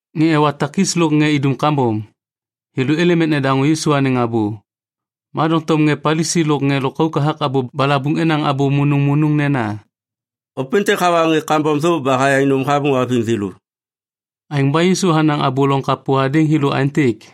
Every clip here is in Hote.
Ŋê ewa takis lôk ŋê idum kambom, thêlô êlêm ek nedaŋô Yisu anêŋ abô. Ma doŋtom ŋê Palisi lôk ŋê lôkauk hathak abô balabuŋ enaŋ abô munuŋmunuŋ nena, “Ôpêntêk hawa ŋê kambom thô ba hayaŋ nôm hamô haviŋ thêlô.” Aêŋ ba Yisu hanaŋ abô loŋ kapô hadêŋ thêlô aêntêk,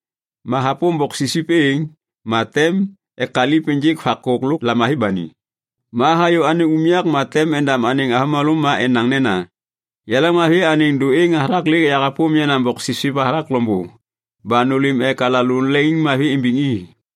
Ma hapôm boksipsip êŋ, ma tem ekaliv ênjêk vakôk lôk lamavi ba ni. Ma hayô anêŋ unyak ma tem endam anêŋ avômalô ma enaŋ nena, ‘Yaleŋmavi anêŋ dôêŋ hathak lêk yahapôm yenaŋ boksipsip hathak loŋbô ba nôlêm ek alalô leŋiŋmavi imbiŋ i.’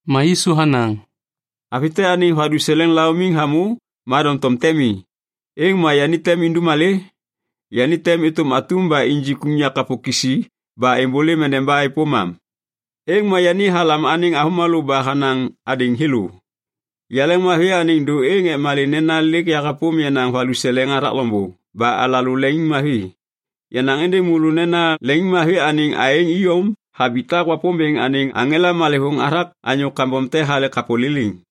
Ma Yisu hanaŋ, “Avi te anêŋ valuseleŋ seleva laumiŋ hamô ma doŋtom te mi. Êŋ ma yani tem indum malê? Yani tem êtôm atum ba injik unyak kapô kisi ba êmbôlêm endeba êpôm am. Êŋ ma yani halam anêŋ avômalô ba hanaŋ hadêŋ thêlô, ‘Yaleŋmavi anêŋ dôêŋ ek malê nena lêk yahapôm yenaŋ valuseleŋ hathak loŋbô ba alalô leŋiŋmavi.’ Yanaŋ êndêŋ môlô nena leŋiŋmavi anêŋ aêŋ iyom habitak Wapômbêŋ anêŋ aŋela malêvôŋ hathak anyô kambom te hale kapô liliŋ.”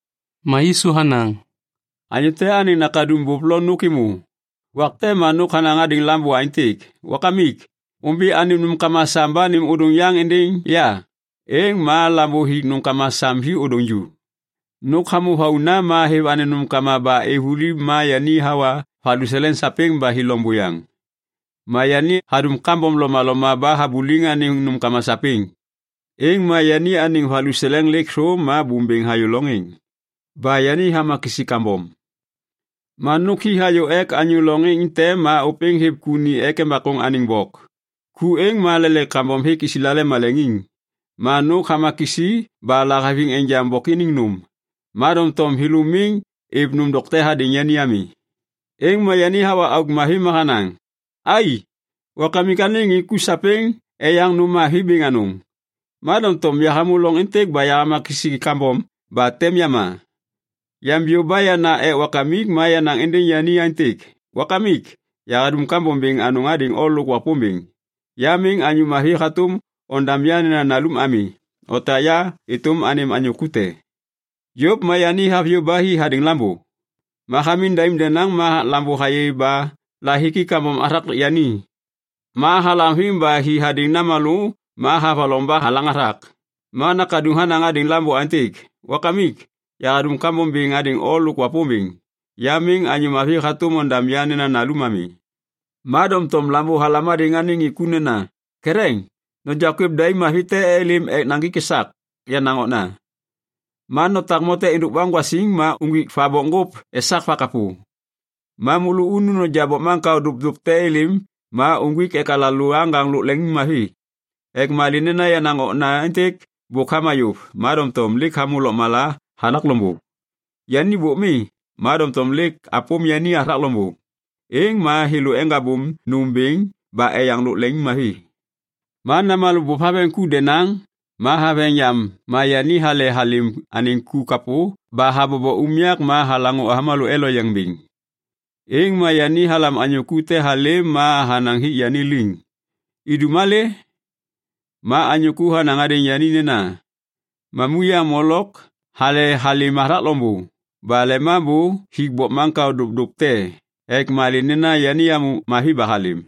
Ma Yisu hanaŋ, “Anyô te anêŋ nakaduŋ bôp lo nôk êmô. Wak te ma nôk hanaŋ hadêŋ lambô aêntêk ‘Wakamik, ômbi anêm nômkama sam ba nêm ôdôŋ yaŋ êndêŋ ya.’ Êŋ ma lambô hik nômkama sam hi ôdôŋ ju. “Nôk hamô vauna ma hêv anêŋ nômkama ba êv vuli ma yani hawa valuseleŋ sapêŋ ba hi loŋ buyaŋ. Ma yani hadum kambom lomaloma ba habuliŋ anêŋ nômkama sapêŋ. Êŋ ma yani anêŋ valuseleŋ lêk thô, ma bôm bêŋ hayô loŋ êŋ. Ba yani hama kisi kambom. Ma nôk hi hayô ek anyô loŋ êŋ te ma ôpêŋ hêv ku ni ek embakôŋ anêŋ bok. Ku êŋ ma lelaik kambom hêk Islael maleŋiŋ. Ma nôk hama kisi ba lahaviŋ enjaŋ bok iniŋ nôm, ma doŋtom thêlô miŋ êv nôm dokte hadêŋ yani ami. “Êŋ ma yani hawa auk mavi ma hanaŋ, ‘Ai, Wakamik anêŋ ŋê ku sapêŋ eyaŋ nôm mavi bêŋ anôŋ. Ma doŋtom yahamô loŋ êntêk ba yahama kisi kambom ba tem yama! Yambiyô ba yana ek wakamik ma yanaŋ êndêŋ yani aêntêk, “Wakamik, yahadum kambom bêŋ hadêŋ o lôk Wapômbêŋ. Ya miŋ anyô mavi hatôm ondam ya nena nalum ami. Otak ya êtôm anêm anyô ku te.” ’ “Yôv ma yani haviyô ba hi hadêŋ lambô. Ma hamiŋ daim denaŋ ma lambô hayê ba lahiki kambom hathak yani. Ma halaŋviŋ ba hi hadêŋ namalô ma havaloŋ ba halaŋ hathak. “Ma nakaduŋ hanaŋ hadêŋ lambô aêntêk, ‘Wakamik yahadum kambom bêŋ hadêŋ o lôk Wapômbêŋ. Ya miŋ anyô mavi hatôm ondam ya nena nalum ami.’ “Ma doŋtom lambô halam hadêŋ anêŋ ŋê ku nena, ‘Ketheŋ! Noja kwêv daim mavi te êlêm ek naŋgik esak yenaŋ okna. Ma notak mote êndôk baŋgwasiŋ ma uŋgwik va bokŋgôp esak vakapô. Ma môlô unu noja bokmaŋkao dopdop te êlêm ma uŋgwik ek alalô aŋgaŋ lôk leŋiŋmavi. Ek malê nena yenaŋ okna êntêk bôk hama yôv, ma doŋtom lêk hamô lôkmala hathak loŋbô. Yani bôk mi, ma doŋtom lêk apôm yani hathak loŋbô.’ Êŋ ma thêlô eŋgabôm nôm bêŋ ba eyaŋ lôk leŋiŋmavi. “Ma namalô bôp haveŋ ku denaŋ. Ma haveŋ yam ma yani hale halêm anêŋ ku kapô ba habobo unyak ma halaŋô avômalô eloyeŋ bêŋ. Êŋ ma yani halam anyô ku te halêm ma hanaŋ hik yani liŋ, ‘Idum malê?’ Ma anyô ku hanaŋ hadêŋ yani nena, ‘Mamuyaŋ molok hale halêm hathak loŋbô ba lemambô hik bokmaŋkao dopdop te ek malê nena yani hamô mavi ba halêm.’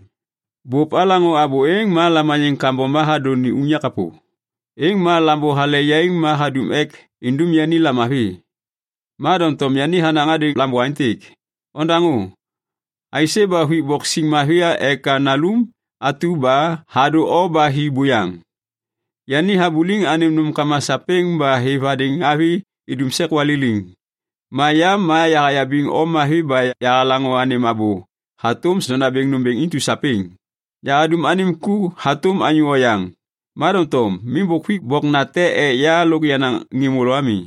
“Bôp halaŋô abô êŋ ma lamaniŋ kambom ba hadô ni unyak kapô. Êŋ ma lambô hale yaiŋ ma hadum ek indum yani lamavi. Ma doŋtom yani hanaŋ hadêŋ lambô aêntêk, ‘Ondaŋô! Aisê ba huik bok siŋ mavi ek nalum atu ba hadô o ba hi buyaŋ. Yani habuliŋ anêm nômkama sapêŋ ba hêv hadêŋ avi idum sek waliliŋ. Ma ya ma yahayabiŋ o mavi ba yahalaŋô anêm abô hatôm sondabêŋ nômbêŋ intu sapêŋ. Yahadum anêm ku hatôm anyô oyaŋ. Ma doŋtom miŋ bôk huik bok nate ek ya lôk yenaŋ ŋê môlô ami.’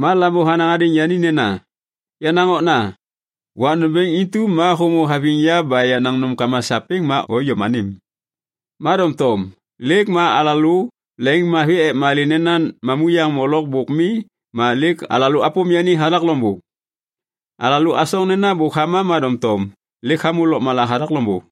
“Ma lambô hanaŋ hadêŋ yani nena, ‘Yenaŋ okna, wak nômbêŋ intu ma hômô haviŋ ya ba yenaŋ nômkama sapêŋ ma o iyom anêm. Ma doŋtom lêk ma alalô leŋiŋmavi ek malê nena mamuyaŋ molok bôk mi ma lêk alalô apôm yani hathak loŋbô. Alalô asoŋ nena bôk hama ma doŋtom lêk hamô lôkmala hathak loŋbô.’”